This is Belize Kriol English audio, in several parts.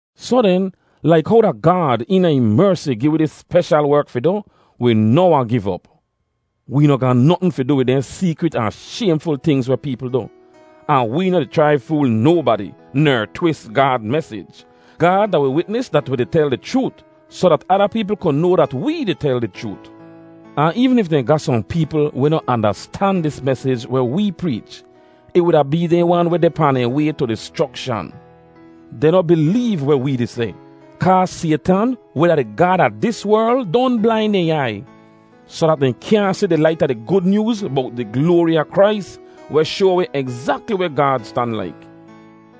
Soh den, laik how da Gaad eena ih mersi gi wi dis speshal werk fi du, wi noh wahn giv op. Wee noh ga notn fi du wid dehn seekrit ahn shaymful tingz weh peepl du. Ahn wee noh di chrai fool nobadi, ner twis Gaad mesij. Gaad da wi witnis dat wi di tel di chroot, soh dat ada peepl ku noa dat wee di tel di chroot. Ahn eevn if dehn ga sohn peepl weh noh andastan dis mesij weh wee preech, ih wuda bee dehn wan weh deh pahn dehn way tu dischrokshan. Dehn noh bileev weh wee di seh, kaa Saytan, weh da di gaad a dis werl, don blain dehn aiy, soh dat dehn kyaahn si di lait a di Gud Nyooz bowt di gloari a Krais, weh shoa wi egzakli weh Gaad stan laik.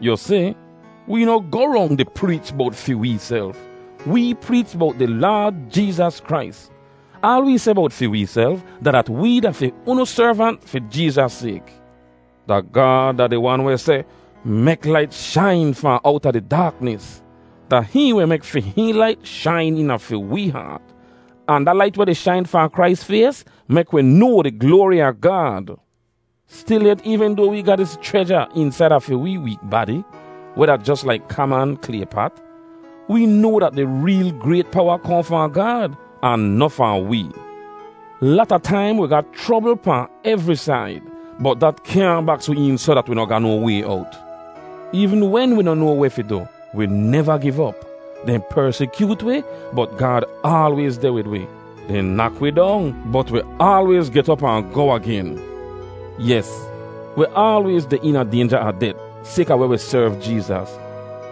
Yu si, wee noh goh rong di preech bowt fi weeself; wee preech bowt di Laad Jeezas Krais. Aal wee seh bowt fi weeself, da dat wee da fi unu servant fi Jeezas sayk. Da Gaad da di Wan weh seh, “Mek lait shain fahn owta di daaknis!” Da hihn weh mek fi hihn lait shain eena fi wee haat. Ahn da lait weh di shain fahn Krais fays mek wi noa di gloari a Gaad. Stilyet, eevn doa wee ga dis chreja eensaida fi wee week badi, weh da jos laik kaman klay pat, wee noa dat di reel grayt powa kohn fahn Gaad, ahn noh fahn wee. Lata taim wi ga chrobl pahn evri said, bot dat kyaahn baks wi een soh dat wi noh ga no way owt. Eevn wen wi noh noa weh fi du, wi neva giv op. Dehn persikyoot wi, bot Gaad aalwayz deh wid wi; dehn nak wi dong, bot wi aalwayz get op ahn goh agen. Yes, wi aalwayz deh eena daynja a det sayka weh wi serv Jeezas.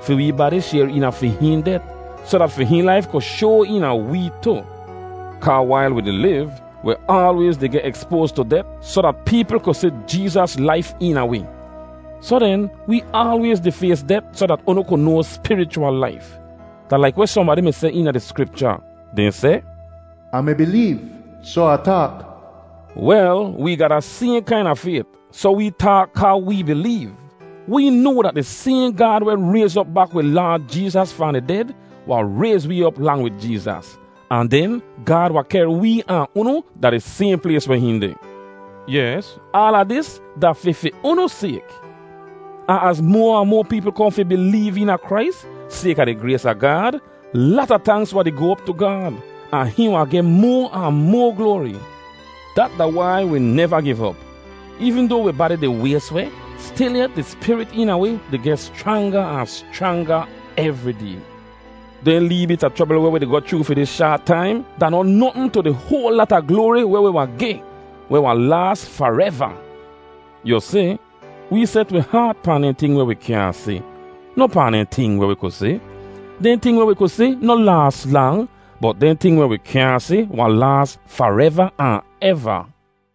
Fi wee badi shayr eena fi hihn det, soh dat fi hihn laif ku shoa eena wee tu. Kaa wail wi di liv, wi aalwayz di geh ekspoaz tu det soh dat peepl ku si Jeezas laif eena wi. Soh den, wee aalwayz di fays det soh dat unu ku noa spirichwal laif. Da laik weh sohnbadi mi seh eena di Skripcha; dehn seh, “Ah mi bileev, soh Ah taak.” Wel, wee ga da sayhn kaina fayt, soh wee taak kaa wee bileev. Wi noa dat di sayhn Gaad weh rayz op bak wi Laad Jeezas fahn di ded, wahn rayz wee op lang wid Jeezas; ahn den Gaad wahn kehr wee ahn unu da di sayhn plays weh hihn deh. Yes, aala dis da fi fi unu sayk. Ahn az moa ahn moa peepl kohn fi bileev eena Krais, sayka di grays a Gaad, lata tanks wahn di goh op tu Gaad, ahn hihn wahn geh moa ahn moa gloari. Dat da wai wi neva giv op. Eevn doa wi badi di ways weh, stilyet di spirit eena wi di geh schranga ahn schranga evri day. Dehn lee bit a chrobl weh wi di goh chroo fi dis shaat taim da noh notn tu di hoal lata gloari weh wi wahn geh, weh wahn laas fareva. Yu si, wee set wi haat pahn dehn ting weh wi kyaahn si, noh pahn dehn ting weh wi ku si. Dehn ting weh wi ku si noh laas lang, bot dehn ting weh wi kyaahn si wahn laas fareva ahn eva.